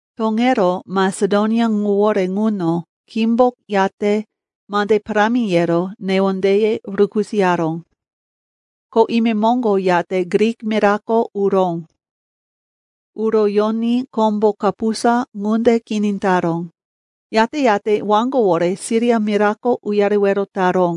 Toŋero Masedonia ŋuwore ŋuno khímbo yate mande parámi yero newondeye rukisoyaró. Ko imemoŋgo yate Grik mirako uró. Uro yoní kombo kapusa ŋunde kini taró. Yate-yate waŋgowore Siria mirako uyarewero taró,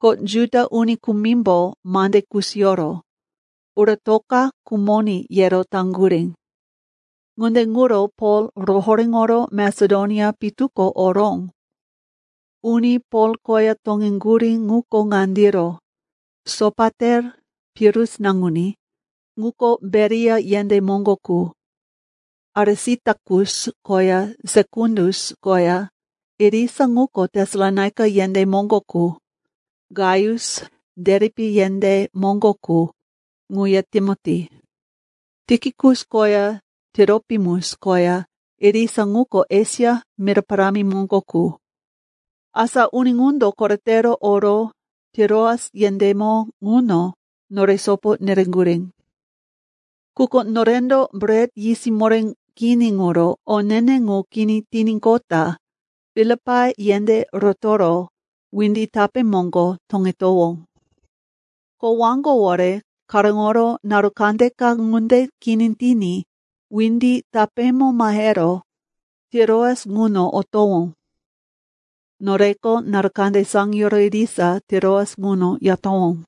ko Juda uni kumimbo mande kusiyoro, uratoka khumoní, yero taŋgurí. Ŋunde ŋuro Pol rohoréŋoro Masedonia pitu ko oró. Uni Pol koya toŋeŋgurí ŋuko ŋandiro: Sopater, Pirus naŋuní, ŋuko Beria yendé moŋgo qu; Arisitakus koya Sekundus koya, irisa ŋuko Tesalonaika yendé moŋgo qu; Gaius, Deripe yendé moŋgo qu, ŋuya Timoti; Tikikus koya Tiropimus koya, irisa ŋuko Esia mira parámi moŋgo qu. Asa uni ŋundo koretero oro Tiroas yendémo ŋuno nore sopo nereŋgurí. Quko norendo Bret Yisiyó Moré Kini ŋuro o ne-ne ŋu kini tiníqota Filipai yendé rotoro windi tapé moŋgo toŋetowó. Ko waŋgowore karóŋoro naru kandeka ŋunde kini tiní windi tapémo mahero Tiroas ŋuno otowó. Noreko naru kande saŋiyoro irisa Tiroas ŋuno yatowó.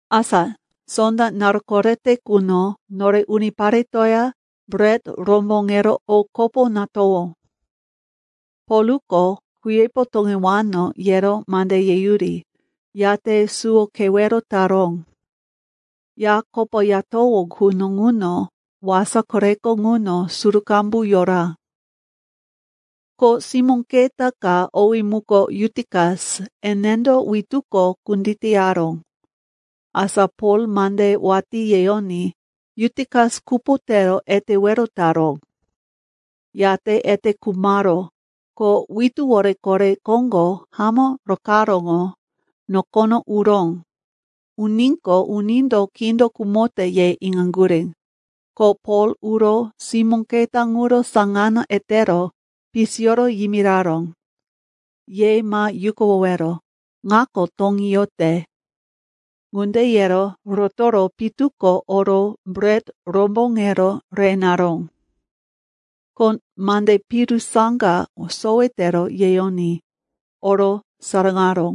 Asa sonda naru korete quno nore uniparetoya bret romboŋero o kopo natowó. Polko, kuyepo toŋewano, yero mande yeyuri, yate suwo kewero taró. Ya kopoyatowó quno ŋuno wasa koreko ŋuno suru qambu yora. Ko simó keta ka, owí muko Yutikas, enendo wituko kunditeyaró. Asa Pol mande watí yeyoní Yutikas kupo tero etewero taró. Yate ete khumaró, ko wituwore kore koŋgo hamó rokaráŋo nokono uró. Uníqo, unindo, kindo khumote, ye iŋaŋgurí. Ko Pol uro simó keta ŋuro saŋano etero pisiyoro yimiraró, “Ye ma yukuwowero. Ŋako toŋí yote.” Ŋunde yero rotoro pitu ko oro bret romboŋero re naró. Ko mande piru saŋga sowe tero yeyoní, oro saraŋaró.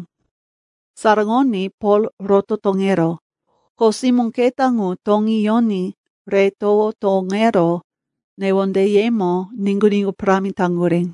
Saraŋoní Pol roto toŋeró. Ko simó keta ŋu toŋí yoní re towo toŋero newondeyemo niŋgu-niŋgu parámi taŋgurí.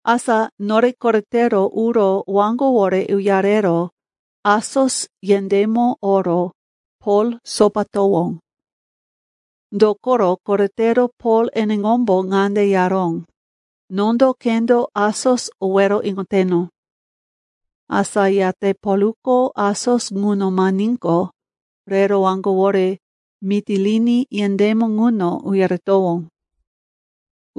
Asa nore koretero uro waŋgowore uyarero Asos yendémo oro Pol sopatowó. Dokoro koretero Pol eneŋombo ŋande yaró, “Nondo khendo Asos owero iŋoteno.” Asa yate Polko Asos ŋuno mahiníqo, rero waŋgowore Mitilini yendémo ŋuno uyaretowó.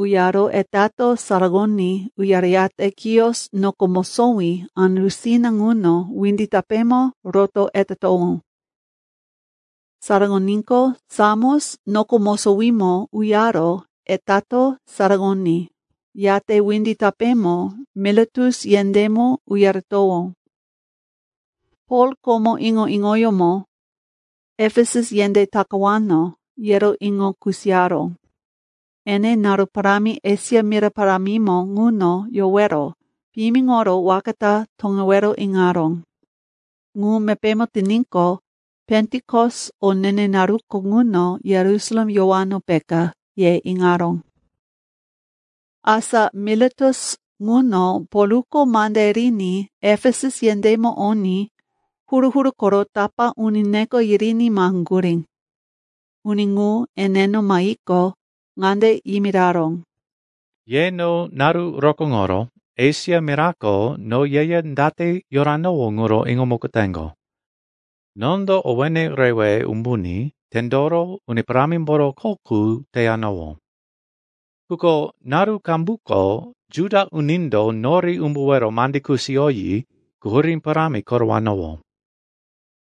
Uyaro etato saraŋoní uyareyate Kios noko mosowí andusina ŋuno windi tapémo roto etatowó. Saraŋoníqo, Samos noko mosowímo uyaro etato saraŋoní, yate windi tapémo Miletus yendémo uyaretowó. Pol komo iŋo-iŋoyómo Efesus yendé takawano, yero iŋo kusiyaró. Ene naru parámi Esia mira parámimo ŋuno yowero piyimiŋoro waka ta toŋewero iŋaró. Ŋu mepémo tiníqo, Pentikos o ne-ne naruko ŋuno Yerusalem yowano, peka, ye iŋaró. Asa Miletus ŋuno Polko mande riní Efesus yendémo oní huru-huru koro tapá uni neko yiriní maheŋgurí. Uni ŋu eneno mahiqo, ŋande yimiraró, “Ye no naru rokóŋoro Esia mirako no yeya date yoranowó ŋuro iŋomukoteŋgo. Nondo owéne rewe umbuní tendoro Uni Parámimboro kho qu teyanowó. Quko naru qambuko Juda unindo nori umbuwero mande kusiyoyi quhurí parámi korowanowó.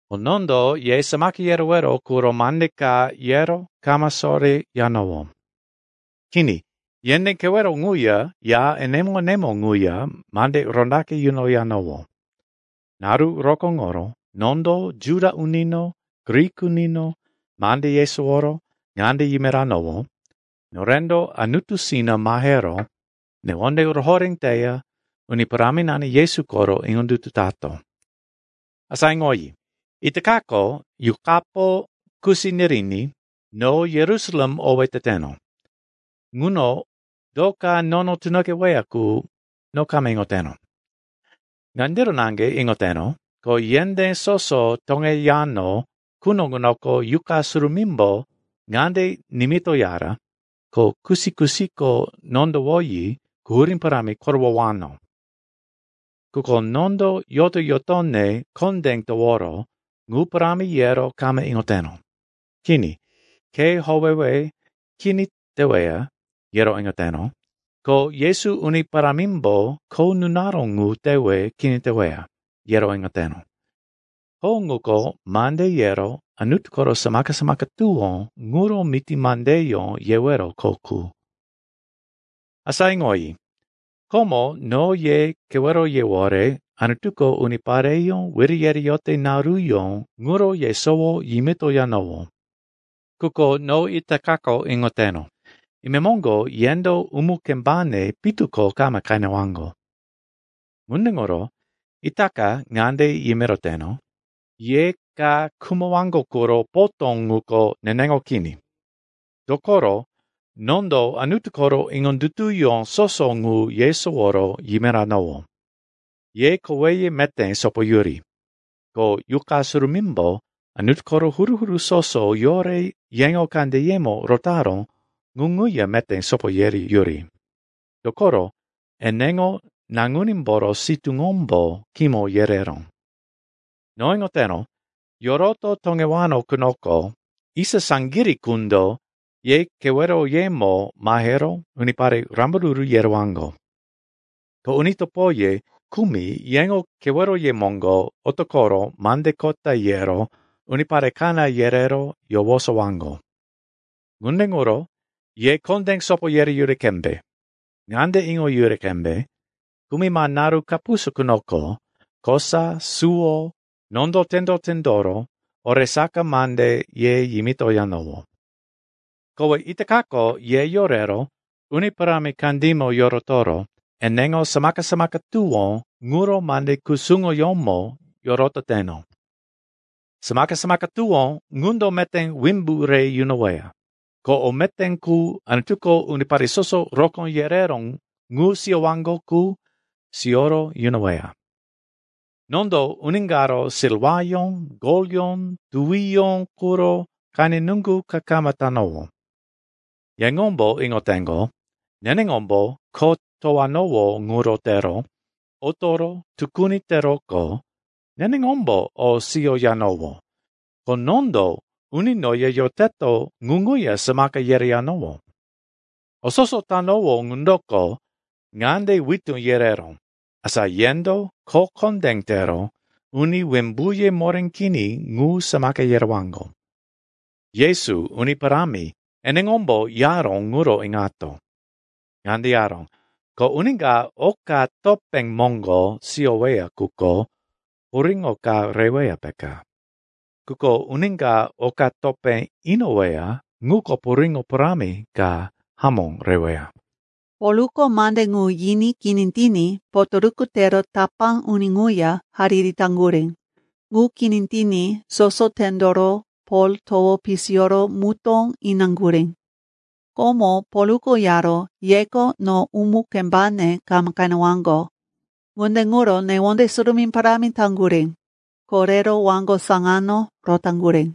Ko nondo ye samaka yerewero quro mande ka yero kama soreyanowó. Kini, yendé kewero ŋuya ya enemo-enemo ŋuya mande rondaqe yunoyanowó. Naru rokóŋoro nondo Juda unino, Grik unino mande yesoworo ŋande yimiranowó, norendo Anutusina mahero newonde rohoré teya Uni Paráminani Yesu koro iŋondutu tato. “Asa iŋoyi, itakako Yuqapo kusi niriní no Yerusalem owé teteno. Ŋuno do ka nono tunoqeweya qu, no kama iŋoteno. Ŋandiro naŋge iŋoteno, ko yendé soso toŋeyano quno ŋunoko Yuqa Surumímbo ŋande nimitoyara, ko kusi-kusiko nondowoyi quhurí parámi korowowano. Quko nondo yoto-yotone kondé toworo ŋu parámi yero kama iŋoteno. Kini, khe howewe kini teweya, yero iŋoteno, ko Yesu Uni Parámimbo kho nunaró ŋu tewe kini teweya, yero iŋoteno. Kho ŋuko mande yero Anutu koro samaka-samaka tuwó ŋuro miti mandeyó yewero kho qu. “Asa iŋoyi, komo no ye keweroyewore Anutuko unipareyó wiri yereyote naruyó ŋuro yesowo yimitoyanowó. Quko no itakako iŋoteno, imemoŋgo yendo umu-kembane pitu ko kama qenewaŋgo. Ŋunde ŋuro itaka ŋande yimiroteno, ye ka khumowaŋgo quro potó ŋuko neneŋo kini. Dokoro nondo Anutu koro iŋondutuyó soso ŋu yesoworo yimiranowó. Ye koweye meté sopoyuri. Ko Yuqa Surumímbo Anutu koro huru-huru soso yore yeŋo kandeyemo rotaró ŋu ŋuya meté sopo yereyuri. Dokoro eneŋo naŋunímboro sitúŋombo kimo yereró. No iŋoteno, yoroto toŋewano qunoko, isa saŋgirí qundo ye keweroyemo mahero unipare rambaruru yerewaŋgo. Ko uni topoye kumi yeŋo keweroye moŋgo otoqoro mande kota yero unipare kaná yerero yowosowaŋgo. Ŋunde ŋuro ye kondé sopo yereyuri qembe. Ŋande iŋoyuri qembe, kumima naru kapusa qunoko kosa suwo nondo tendo-tendoro oresaka mande ye yimitoyanowó. “Kowe itakako ye yorero Uni Parámi kandímo yorotoro eneŋo samaka-samaka tuwó ŋuro mande kusuŋoyómo yorototeno. Samaka-samaka tuwó ŋundo meté wimbu re yunoweya, ko o meté qu Anutuko unipare soso rokó yereró ŋu siyowaŋgo qu siyoro yunoweya. Nondo uni karo silwayó, golyó, tuwiyó quro qene nuŋgu ka kama tanowó. Yeŋombo iŋoteŋgo, neneŋombo kho towanowó ŋuro tero otoro tukuni teroqo neneŋombo o siyoyanowó, ko nondo uni noya yoteto ŋu ŋuya samaka yereyanowó. O soso tanowó ŋundoko ŋande witú yereró, asa yendo kho kondé tero uni wimbuye moré kini ŋu samaka yerewaŋgo. Yesu Uni Parámi eneŋombo yaró ŋuro iŋato. Ŋande yaró, ‘Ko uni ka oka topé moŋgo siyoweya quko puriŋo ka reweya, peka. Quko uni ka oka topé inoweya ŋuko puriŋo parámi ka hamó reweya.’” Polko mande ŋu yiní kini tiní potoruku tero tapá uni ŋuya hariri taŋgurí. Ŋu kini tiní soso tendoro Pol towo pisiyoro mutó inaŋgurí. Komo Polko yaró, “Yeko no umu-kembane kama qenewaŋgo,” ŋunde ŋuro newonde surumí parámi taŋgurí. Ko rero waŋgo saŋano rotaŋgurí.